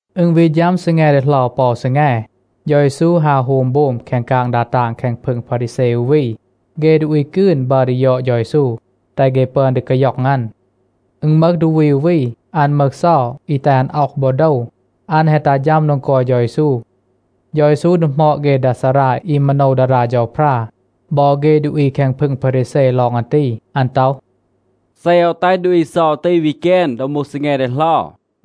อึณ วี ฌัม ซีแง ดีเหลา ปอ อู ซีแง, เฌา เยซู ฮาว โฮม โบม แคง กาง ดา ตาง แคง พึง พารีแซ อู วี. เฆ ดูอี กืน บัร ดี ยอด เฌา เยซู, แตห เฆ ปึอน ดี กาย็อง อัน. อึณ มึห ดูอี อู วี, อัน มึห เซา อี แตห อัน อ็อห บอ โดว. อัน แฮะ ตัห ฌัม โดง กอย เฌา เยซู. เฌา เยซู ดีหมอด เฆ ดา ซารา อี มาโนว ดารา เฌาพรา บอ เฆ ดูอี แคง พึง พารีแซ ลอง อัน ตี. อัน ต็อห, “เซ โอว แตห ดูอี เซา ตี วี แกน ดอ มูห ซีแง ดีเหลา,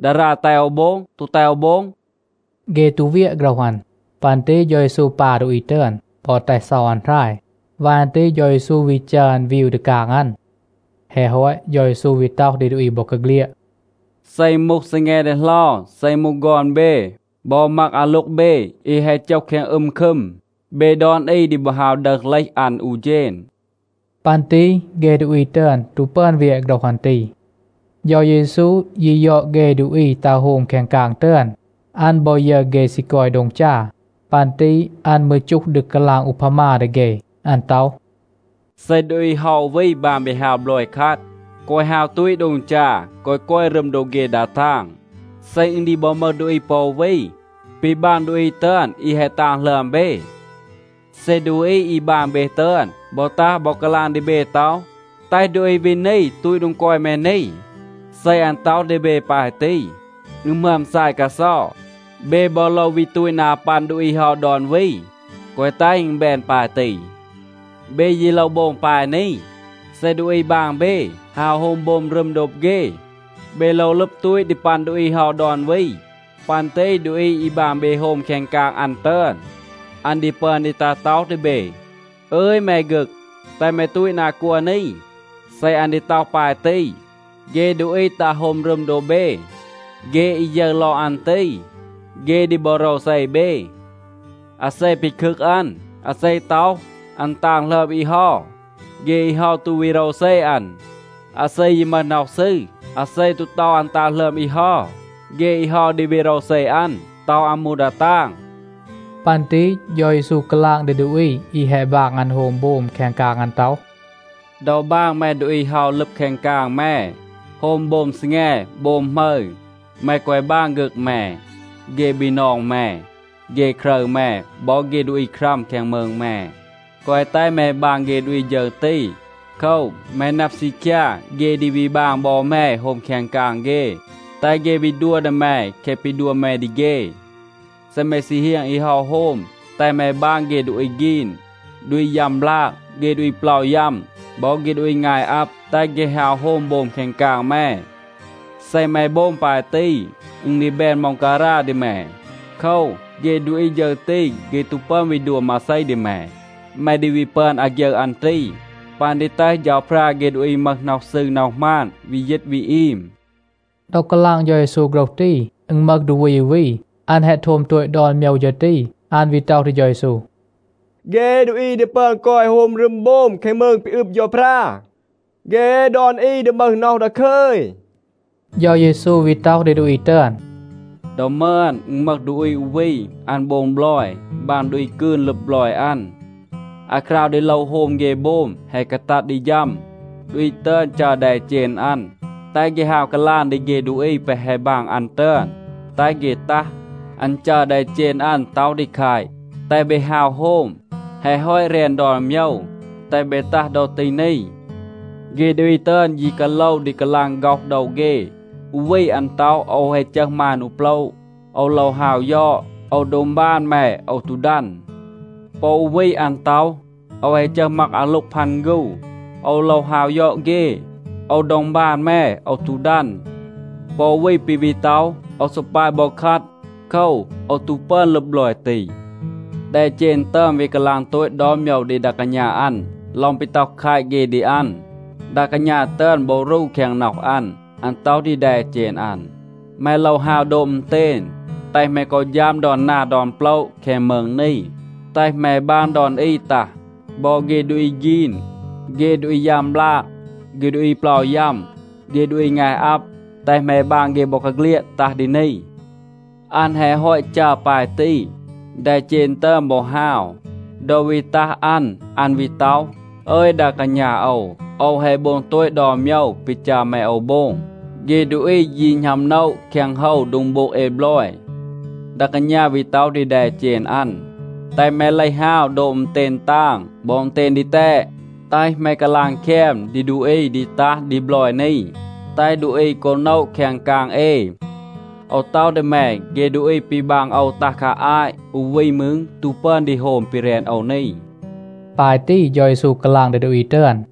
ดารา แตห โอว โบง, ตู แตห โอว โบง?” เฆ ตู เวียะ โฆรห อัน. ปัน ตี เฌา เยซู ปา ดูอี ตึอน, บอ แตห เซา อัน หราย. วาย อัน ตี เฌา เยซู วี จัร อัน วีว ดี กาง อัน. แฮะ ฮอต, เฌา เยซู วี ต็อห ดี ดูอี บอกาเฆลียด, “เซ อึณ มูห ซีแง ดีเหลา, เซ อึณ มูห ฆอน เบ บอ มัก อาโล็ง เบ อี แฮะ โจห แคง อึม คึม, เบ ดอน อี ดี บอ ฮาว ดึห เลห อัน อู เฌณ.” ปัน ตี เฆ ดูอี ตึอน ตู ปึอน เวียะ โฆรห อัน ตี. เฌา เยซู ยี ยอด เฆ ดูอี ตัห โฮม แคง กาง ตึอน. อัน บอ ยึร เฆ ซี กอย โดง จา. ปัน ตี อัน มืร จูห ดี กาลาง อูพามา ดี เฆ. อัน ต็อห, “เซ ดูอี เฮา อู วี บาง เบ ฮาว บลอย คัด, แกวะ ฮาว ตูต โดง จา, แกวะ กอย รึม โดบ เฆ ดา ตาง. เซ อึณ ดี บอ มึห ดูอี ปอ อู วี ปี บาง ดูอี ตึอน อี แฮะ ตาง หลึอม เบ, เซ ดูอี อี บาง เบ ตึอน บอ ตัห บอ กาลาง ดี เบ ต็อห, ‘แตห ดูอี วี นี ตูต โดง กอย แม นี.’ เซ อัน ต็อห ดี เบ ปาย ตี, อึณ หมึอม ซาย กาเซา. เบ บอ โลว วี ตูต นา ปัน ดูอี เฮา ดอน วี. แกวะ แตห อึณ แบน ปาย ตี. เบ ยี โลว โบง ปาย นี. เซ ดูอี บาง เบ ฮาว โฮม โบม รึม โดบ เฆ, เบ โลว ลึบ ตูต ดี ปัน ดูอี เฮา ดอน วี. ปัน ตี ดูอี อี บาง เบ โฮม แคง กาง อัน ตึอน, อัน ดี ปึอน ดี ตัห ต็อห ดี เบ, ‘อึย แม ฆึก, แตห แม ตูต นา กัว นี.’ เซ อัน ดี ต็อห ปาย ตี, เฆ ดูอี ตัห โฮม รึม โดบ เบ, เฆ อี ยึร ลอง อัน ตี, เฆ ดี บอ โรวเซ เบ. อาเซ ปีคึก อัน, อาเซ ต็อห, อัน ตาง หลึอม อี เฮา, เฆ อี เฮา ตู วี โรวเซ อัน. อาเซ ยี มึห น็อห ซืร, อาเซ ตู ต็อห อัน ตาง หลึอม อี เฮา, เฆ อี เฮา ดี วี โรวเซ อัน, ต็อห อัน มูห ดา ตาง.” ปัน ตี เฌา เยซู กาลาง ดี ดูอี อี แฮะ บาง อัน โฮม โบม แคง กาง อัน ต็อห, “ดอ บาง แม ดูอี ฮาว ลึบ แคง กาง แม, โฮม โบม ซีแง, โบม หมึร, แม แกวะ บาง ฆึก แม, เฆ บีนอง แม, เฆ ครึร แม บอ เฆ ดูอี ครัม แคง มืง แม. แกวะ แตห แม บาง เฆ ดูอี ฌึร ตี. โคว, แม นับ ซีคยา, เฆ ดี วี บาง บอ แม โฮม แคง กาง เฆ, แตห เฆ วี ดัว ดี แม แคะ ปี ดัว แม ดี เฆ. เซ แม ซี เฮียง อี เฮา โฮม, แตห แม บาง เฆ ดูอี ฆีน, ดูอี ยัม บลาก, เฆ ดูอี เปลา ยัม, บอ เฆ ดูอี งาย อับ, แตห เฆ ฮาว โฮม โบม แคง กาง แม. เซ แม โบง ปาย ตี, อึณ ดี แบน ม็องการา ดี แม. โคว, เฆ ดูอี ฌึร ตี, เฆ ตู ปึอน วี ดัว มาเซ ดี แม. แม ดี วี ปึอน อาฆยึร อัน ตี, ปัน ดี แตห เฌาพรา เฆ ดูอี มึห น็อห ซืร น็อห หมาน วี ยีต วี อีม.” ดอ กาลาง เฌา เยซู โฆรห ตี, อึณ มึห ดูอี อู วี. อัน แฮะ โทม โตต ดอน โมยว ฌึร ตี, อัน วี ต็อห ดี เฌา เยซู, “เฆ ดูอี ดี ปึอน กอย โฮม รึม โบม แคง มืง ปี อึบ เฌาพรา, เฆ ดอน อี ดี มึห น็อห ดาคึย.” เฌา เยซู วี ต็อห ดี ดูอี ตึอน, “ดอ มึอน, อึณ มึห ดูอี อู วี, อัน โบง บลอย, บาง ดูอี กืน ลึบ บลอย อัน. อาคราว ดี โลว โฮม เฆ โบม แฮะ กาตัด ดี ฌัม, ดูอี ตึอน จัร แดเจณ อัน, แตห เฆ ฮาว กาลาง ดี เฆ ดูอี แปะ แฮะ บาง อัน ตึอน, แตห เฆ ตัห. อัน จัร แดเจณ อัน ต็อห ดี แคต, ‘แตห เบ ฮาว โฮม. แฮะ ฮอต แรน ดอน โมยว. แตห เบ ตัห ดอ ตี นี.’ เฆ ดูอี ตึอน ยี กาโลว ดี กาลาง ฆ็อห โดว เฆ. อู วี อัน ต็อห, ‘โอว แฮะ จึห มาน อู โปละ. โอว โลว ฮาว ยอด. โอว ดองบาน แม, โอว ตู ดัน.’ ปอ อู วี อัน ต็อห, ‘โอว แฮะ จึห มัก อาโล็ง พัน ฆู. โอว โลว ฮาว ยอด เฆ. โอว ดองบาน แม, โอว ตู ดัน.’ ปอ อู วี ปี วี ต็อห, ‘โอว ซอ ปาย บอ คัด. โคว, โอว ตู ปึอน ลึบ บลอย ตี.’ แดเจณ ตึอน วี กาลาง โตต ดอน โมยว ดี ดา กาณา อัน ลอง ปี ต็อห แคต เฆ ดี อัน. ดา กาณา ตึอน บอ รู แคง น็อห อัน. อัน ต็อห ดี แดเจณ อัน, ‘แม โลว ฮาว โดบ อึณเตณ, แตห แม กอ ฌัม ดอน นา ดอน โปละ แคง มืง นี. แตห แม บาง ดอน อี ตัห. บอ เฆ ดูอี ฆีน, เฆ ดูอี ยัม บลาก, เฆ ดูอี เปลา ยัม, เฆ ดูอี งาย อับ, แตห แม บาง เฆ บอกาเฆลียด ตัห ดี นี.’ อัน แฮะ ฮอต จัร ปาย ตี, แดเจณ ตึอน บอ ฮาว. ดอ วี ตัห อัน, อัน วี ต็อห, ‘อึย ดา กาณา โอว, โอว แฮะ โบง โตต ดอน โมยว ปี จัร แม โอว โบง. เฆ ดูอี ยี หณัม โนะ แคง โฮว โดง โบง เอ บลอย.’ ดา กาณา วี ต็อห ดี แดเจณ อัน, ‘แตห แม เลห ฮาว โดบ อึณเตณ ตาง บอ อึณเตณ ดีแตด. แตห แม กาลาง แคม ดี ดูอี ดี ตัห ดี บลอย นี, แตห ดูอี กอ โนะ แคง กาง เอ. โอว ต็อห ดี แม, เฆ ดูอี ปี บาง โอว ตัห คา อาต อู วี มืร ตู ปึอน ดี โฮม ปี แรน โอว นี.’” ปาย ตี เฌา เยซู กาลาง ดี ดูอี ตึอน.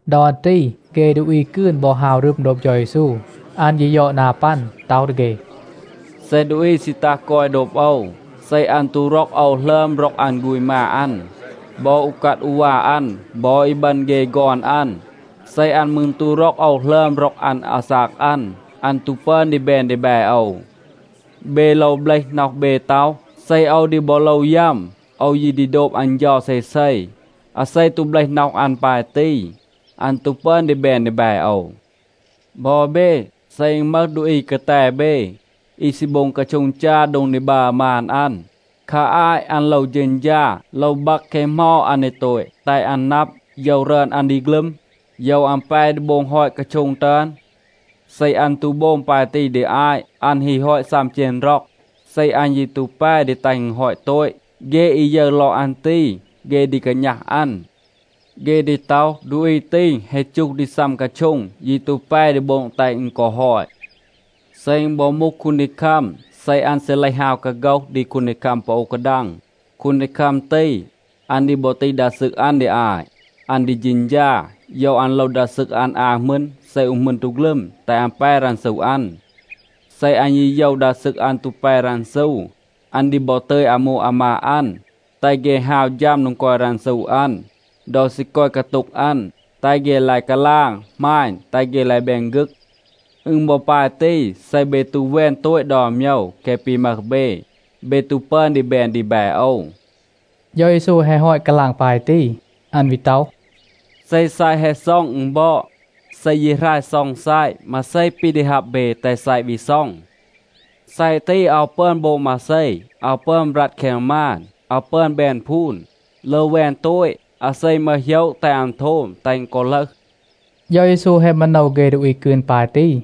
ดอ อัน ตี เฆ ดูอี กืน บอ ฮาว รึม โดบ เฌา เยซู. อัน ยี ยอด นา ปัน, ต็อห ดี เฆ, “เซ ดูอี ซี ตัห กอย โดบ โอว, เซ อัน ตู ร็อก โอว หลึอม ร็อก อัน ฆูณ มา อัน, บอ อูกัด อูวา อัน บอ อีบึณ เฆ ฆอน อัน, เซ อัน มืร ตู ร็อก โอว หลึอม ร็อก อัน อาซาก อัน, อัน ตู ปึอน ดี แบน ดีแบ โอว. เบ โลว เบลห น็อห เบ ต็อห, ‘เซ โอว ดี บอ โลว ยัม, โอว ยี ดี โดบ อัน เฌา เซเซ.’ อาเซ ตู เบลห น็อห อัน ปาย ตี, อัน ตู ปึอน ดี แบน ดีแบ โอว. บอ เบ, เซ อึณ มึห ดูอี กาแต เบ, อี ซี โบง กาโช็ง จา โดง ดี บัร มาน อัน, คา อาต อัน โลว เฌณฌา, โลว บัก แคะ เหมา อัน ดี โตต, แตห อัน นับ, โยว รึอน อัน ดี ฆลึม, โยว อัน แป ดี โบง ฮอต กาโช็ง ตึอน. เซ อัน ตู โบง ปาย ตี ดี อาต, อัน ฮี ฮอต ซัม เจณ ร็อง, เซ อัน ยี ตู แป ดี แตห อึณ ฮอต โตต, เฆ อี ยึร ลอง อัน ตี, เฆ ดี กาณัห อัน. เฆ ดี ต็อห, ‘ดูอี ตี แฮะ จูห ดี ซัม กาโช็ง, ยี ตู แป ดี โบง แตห อึณ กอ ฮอต.’ เซ อึณ บอ มูห คูนดีคัม, เซ อัน ซี เลห ฮาว กาโฆห ดี คูนดีคัม ปอ อู กาดัง, คูนดีคัม ตี, อัน ดี บอ ตีห ดา ซึก อัน ดี อาต. อัน ดี เฌณฌา, โยว อัน โลว ดา ซึก อัน อา หมึณ เซ อู หมึณ ตู ฆลึม, แตห อัน แป รันซู อัน. เซ อัน ยี โยว ดา ซึก อัน ตู แป รันซู, อัน ดี บอ ตึย อามู อามาด อัน, แตห เฆ ฮาว ฌัม โดง กอย รันซู อัน, ดอ ซี กอย กาโต็ง อัน. แตห เฆ ลาย กาลาง, หมาณ, แตห เฆ ลาย แบน ฆึก. อึณ บอ ปาย ตี. เซ เบ ตู แวน โตต ดอน โมยว แคะ ปี มึห เบ, เบ ตู ปึอน ดี แบน ดีแบ โอว.” เฌา เยซู แฮะ ฮอต กาลาง ปาย ตี, อัน วี ต็อห, “เซ ซัยะ แฮะ ซ็อง, อึณ บอด. เซ ยี หราย ซ็อง ซัยะ, มาเซ ปี ดี ฮับ เบ, แตห ซัยะ วี ซ็อง? ซัยะ ตี, อาว ปึอน โบง มาเซ. อาว ปึอน บรัด แคง มาน, อาว ปึอน แบน พูน. โลว แวน โตต. อาเซ มึห โหยะ แตห อัน โทม, แตห อึณ กอ ลึห.” เฌา เยซู แฮะ มาโนว เฆ ดูอี กืน ปาย ตี.